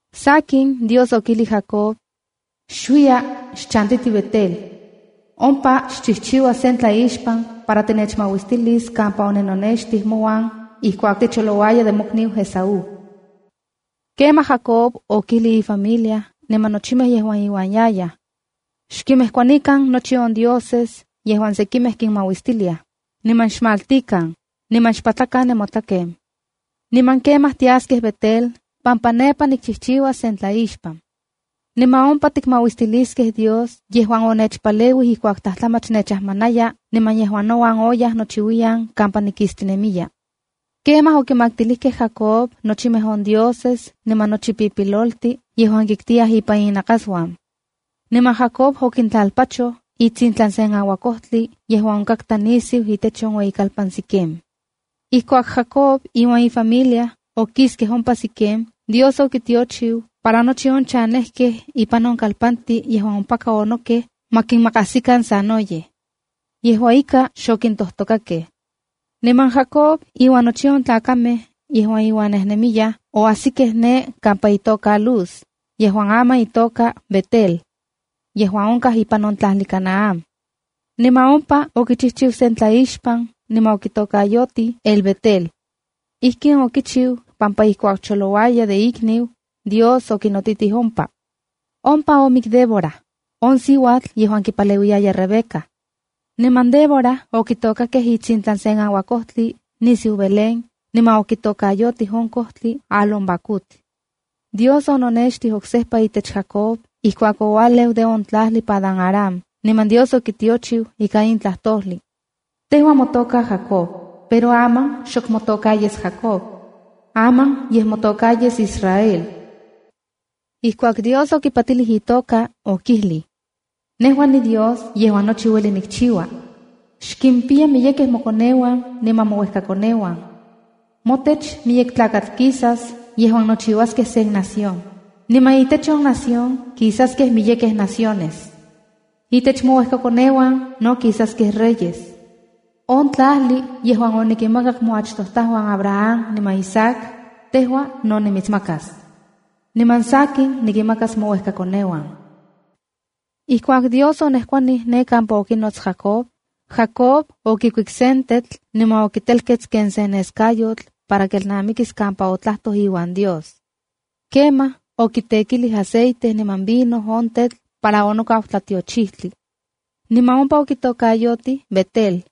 Sakin, Dios okijlij Jacob: “Xuiya, xchantiti Betel. Ompa xchijchiua sen tlaixpan para tinechmauistilis kampa oninonextij mouan ijkuak ticholouaya de mokniu Esaú.” Kemaj Jacob okijlij ifamilia niman nochimej yejuan iuan yayaj: —Xkinmejkuanikan nochi on dioses yejuan sekimej kinmauistiliaj, niman xmaltikan, niman xpatlakan nemotlaken. Niman kemaj, tiaskej Betel pampa nepa nikchijchiuas sen tlaixpan. Niman ompa tikmauistiliskej Dios yejuan onechpaleuij ijkuak tlajtlamach nechajmanaya niman yejuan nouan oyaj nochiuiyan kampa nikistinemiya. Kemaj okimaktilijkej Jacob nochimej on dioses niman nochi on pipiloltin yejuan kiktiyaj ipan innakasuan. Niman Jacob okintlalpachoj itsintlan sen auakojtli yejuan onkatka nisiu itech on ueyikalpan Siquem. Ijkuak Jacob iuan ifamilia okiskej ompa Siquem, Dios okichiu para nochi on chanejkej ipan on kalpantin yejuan ompaka onokej ma kinmakajsikan sanoyej. Yejua ika, xokintojtokakej. Niman Jacob iuan nochi on tlakamej yejuan iuan nejnemiyaj oajsikej ne kampa itoka Luz (yejuan aman itoka Betel) yejuan onkaj ipan on tlajli Canaán. Niman ompa okichijchiu sen tlaixpan niman okitokayotij El-Betela. Ijkin okichiu pampa ijkuak cholouaya de ikniu, Dios okinotitij ompa. Ompa omik Débora, on siuatl yejuan kipaleuiyaya Rebeca. Niman Débora okitokakej itsintlan sen auakojtli nisiu Belén, niman okitokayotij on kojtli “Alón-bacut”b. Dios ononextij oksejpa itech Jacob ijkuak oualeu de on tlajli Padan-aram niman Dios okitiochiu ika in tlajtojli: “Tejua motoka Jacob, pero aman xok motoka yes Jacobc. Aman yej motoka yes Israel”d. Ijkuak Dios okipatilij itoka, okijlij: “Nejua niDios yejuan nochi ueli kichiua. Xkimpiya miyekej mokoneuan niman mouejkakoneuan. Motech miyek tlakatl kisas yejuan nochiuaskej sen nación, niman itech on nación kisaskej miyekej naciones. Intech mouejkakoneuan no kisaskej reyes.” On tlajli yejuan onikinmakak moachtojtajuan Abraham niman Isaac, tejua no nimitsmakas, niman sakin, nikinmakas mouejkakoneuan.” Ijkuak Dios onejkuanij ne kampa okinots Jacob, Jacob okikuik sen tetl niman okitelkets ken sen neskayotl para kelnamikis kampa otlajtoj iuan Dios. Kemaj okitekilij aceite niman vino on tetl para onokau tlatiochijtli. Niman ompa okitokayotij Betele.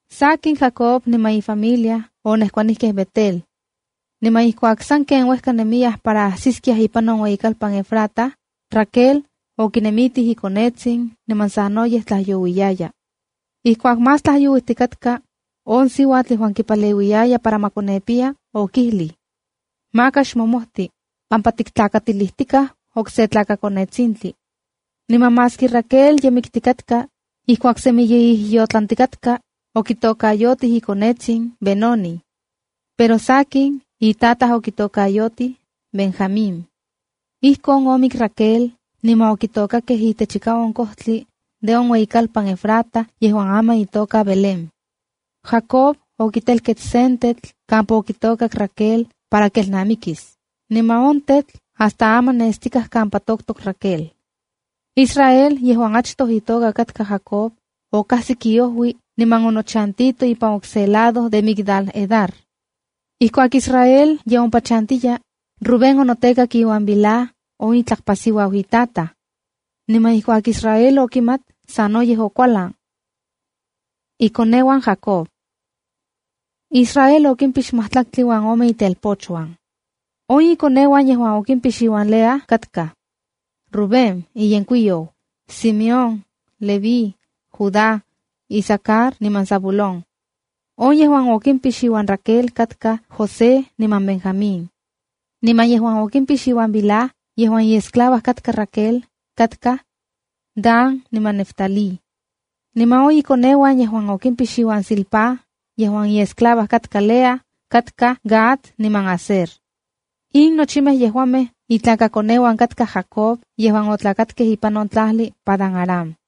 Sakin, Jacob niman ifamilia onejkuanijkej Betel. Niman ijkuak sanken uejka nemiyaj para ajsiskiaj ipan on ueyikalpan Efrata, Raquel okinemitij ikonetsin, niman sanoyej tlajyouiyaya. Ijkuak más tlajyouijtikatka, on siuatl yejuan kipaleuiyaya para ma konepiya okijlij: “Maka xmomojti, pampa tiktlakatilijtikaj okse tlakakonetsintli.” Niman maski Raquel ye miktikatka, ijkuak semi ye ijyotlantikatka, okitokayotij ikonetsin Benonif. Pero sakin, itataj okitokayotij, Benjamíng. Ijkon omik Raquel, niman okitokakej itechika on ojtli de on ueyikalpan Efrata yejuan aman itoka Belén. Jacob okitelkets sen tetl kampa okitokak Raquel para kelnamikis, niman on tetl hasta aman nestikaj kampa toktok Raquel. Israel yejuan achtoj itoka katka Jacob, okajsik iojui niman onochantito ipan okse lado de Migdal-Edar. Ijkuak Israel ye ompa chantiya, Rubén onotekak iuan Bilha, on itlakpasiuau itataj. Niman ijkuak Israel okimat, sanoyej okualan. Ikoneuan Jacob Israel okimpix majtlaktli uan ome itelpochuan. On ikoneuan yejuan okimpix iuan Lea katkaj: Rubén iyenkuiyou, Simeón, Leví, Judá, Isacar niman Zabulón. On yejuan okimpix iuan Raquel katkaj José niman Benjamín. Niman yejuan okimpix iuan Bilha, yejuan iesclava katka Raquel, katkaj: Dan niman Neftalí. Niman on ikoneuan yejuan okimpix iuan Zilpá, yejuan iesclava katka Lea, katkaj Gad niman Aser. In nochimej yejuamej itlakakoneuan katkaj Jacob yejuan otlakatkej ipan on tlajli Padán-aram.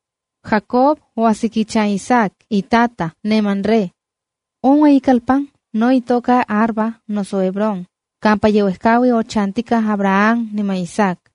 Jacob oajsik ichan Isaac itataj, ne Mamre. On ueyikalpan no itoka Arba noso Hebrón, kampa yeuejkaui ochantijkaj Abraham niman Isaac.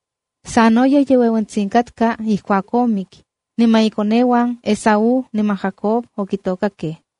Sanoyej ye ueuentsitsin katka ijkuak omik, niman Esaú niman Jacob, ikoneuan okitokakej.